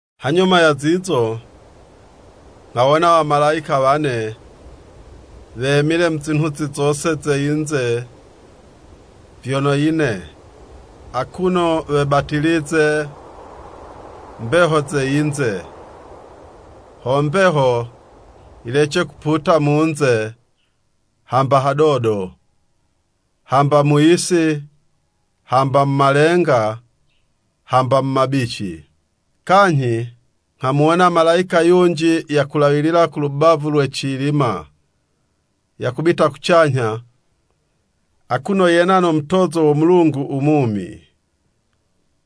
Hanyuma ya zizo, nghawona wamalayika wane, wemile mu zinhuzi zose ze yinze vyono yine, akuno webatilize mbeho ze yinze, ho mbeho yilece kuputa mu'nze hamba hadodo, hamba mu yisi, hamba mu malenga, hamba mu mabici. Kanyhi nghamuwona malayika yunji yakulawilila ku lubavu lwe cilima yakubita kucanyha, akuno yena no mutozo wo Mulungu u mumi.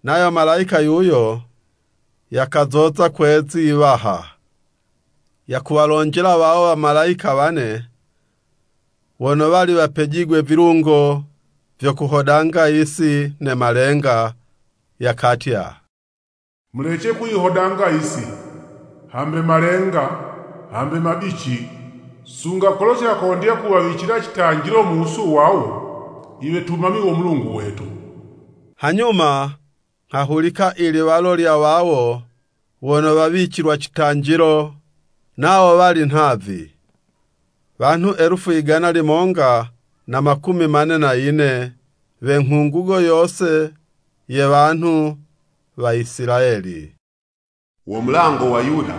Nayo malayika yuyo yakazoza kwe'zi 'waha, yakuwalonjela wawo wamalayika wane, wono wali wapejigwe vilungo vyo kuhodanga yisi ne malenga, yakatya, “Mulece kuyihodanga yisi, hambe malenga, hambe mabici, sunga kolo cakondya kuwawicila citanjilo mu wusu wawo, i wetumami wo Mulungu wetu.” Hanyuma nghahulika i liwalo lya wawo wono wawicilwa citanjilo, nawo wali nhavi, wanhu elufu igana limonga na makumi mane na yine we nghungugo yose ye wanhu wa Isilayeli. Wo mulango wa Yuda,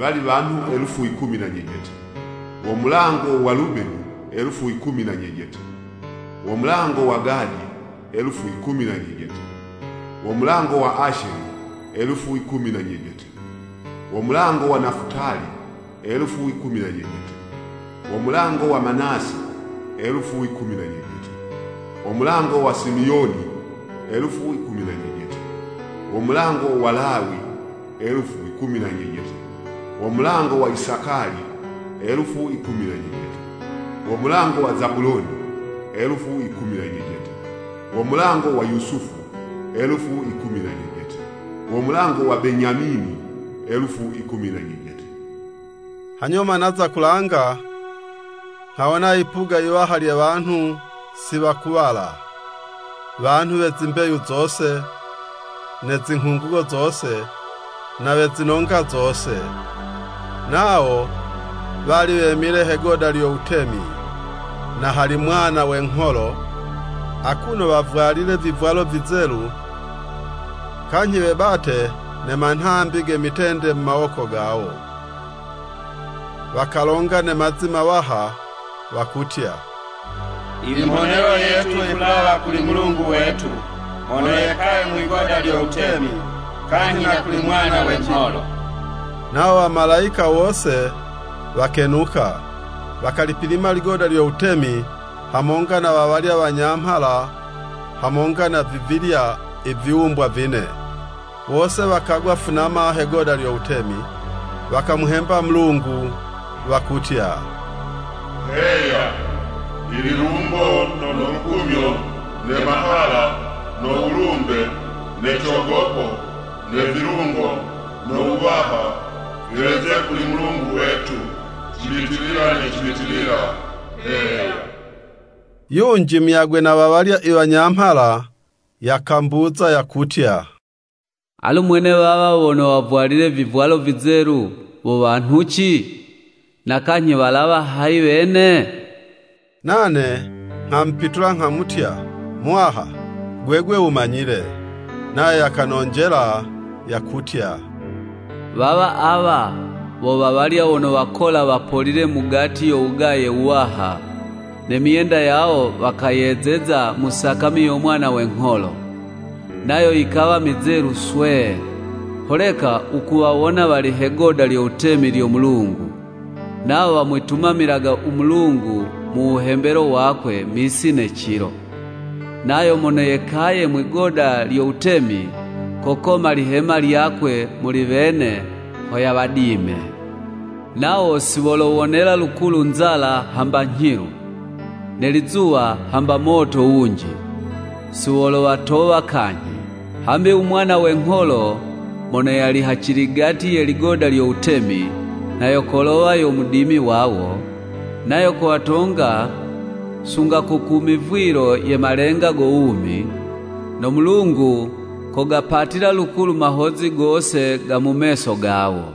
wali wanhu elufu yikumi na nyejete. Wo mulango wa Lubeni, elufu yikumi na nyejete wo mulango wa Gadi, elufu yikumi na nyejete. Wo mulango wa Asheli, elufu yikumi na nyejete. Wo mulango wa Nafutali, elufu yikumi na nyejete. Wo mulango wa Manase, elufu yikumi na nyejete. Wo mulango wa Simiyoni, elufu yikumi na nyejete. Wo mulango wa Lawi, elufu yikumi na nyejete. Wo mulango wa Isakali, elufu yikumi na nyejete. Wo mulango wa Zabuloni, elufu yikumi na nyejete. Wo mulango wa Yusufu, elufu yikumi na nyejete. Wo mulango wa Benyamini, elufu yikumi na nyejete. Hanyuma naza kulanga, nghawona yipuga yiwaha lye wanhu si wakuwala, wanhu we zimbeyu zose, ne zinghungugo zose, na we zinonga zose. Nawo wali wemile he'goda lyo wutemi, na hali Mwana we ngholo, akuno wavwalile vivwalo vizelu, kanyhi webate ne manhambi ge mitende mu mawoko gawo. Wakalonga ne mazi mawaha, wakutya “I mhonelo yetu yikulawa kuli Mulungu wetu mono yekaye mwigoda lyo wutemi, kanyhi na kuli Mwana we ngholo!” Nawo wamalayika wose wakenuka, wakalipilima ligoda lyo wutemi, hamonga na wa walya wanyamhala hamonga na vivilya i viwumbwa vine. Wose wakagwa funama he'goda lyo wutemi, wakamuhemba Mulungu, wakutya, “Heya! I lilumbo no lukumyo, ne mahala, no wulumbe, ne cogopo, ne vilungo no wuwaha, viweze kuli Mulungu wetu cibitilila ne cibitilila! Heya!” Yunji muyagwe na wa walya i wanyamhala, yakambuza yakutya, “Alu mwene wawa wono wavwalile vivwalo vizelu, wo wanhuci? Na kanyhi, walawa hayi wene?” Nane nghamupitula nghamutya, “Muwaha, gwegwe wumanyile!” Nayo yakanonjela yakutya, “Wawa awa, wo wawalya wono wakola wapolile mugati yo wugaye wuwaha. Ne myenda yawo, wakayezeza mu sakami yo Mwana we ngholo, nayo yikawa mizelu swee. Holeka wukuwawona wali he'goda lyo wutemi lyo Mulungu. Nawo wamwitumamilaga u Mulungu mu wuhembelo wakwe, misi ne cilo, nayo mono yekaye mwi'goda lyo wutemi, kokoma lihema lyakwe muli wene ho yawadime. “Nawo si wolowonela lukulu nzala hamba nyhilu, ne lizuwa hamba moto wunji, si wolowatowa kanyhi, hambi u Mwana we ngholo mono yali haciligati ye ligoda lyo wutemi, nha yo kolowa yo mudimi wawo, nayo kowatonga sunga ko ku mivwilo ye malenga go wumi. No Mulungu kogapatila lukulu mahozi gose ga mu meso gawo.”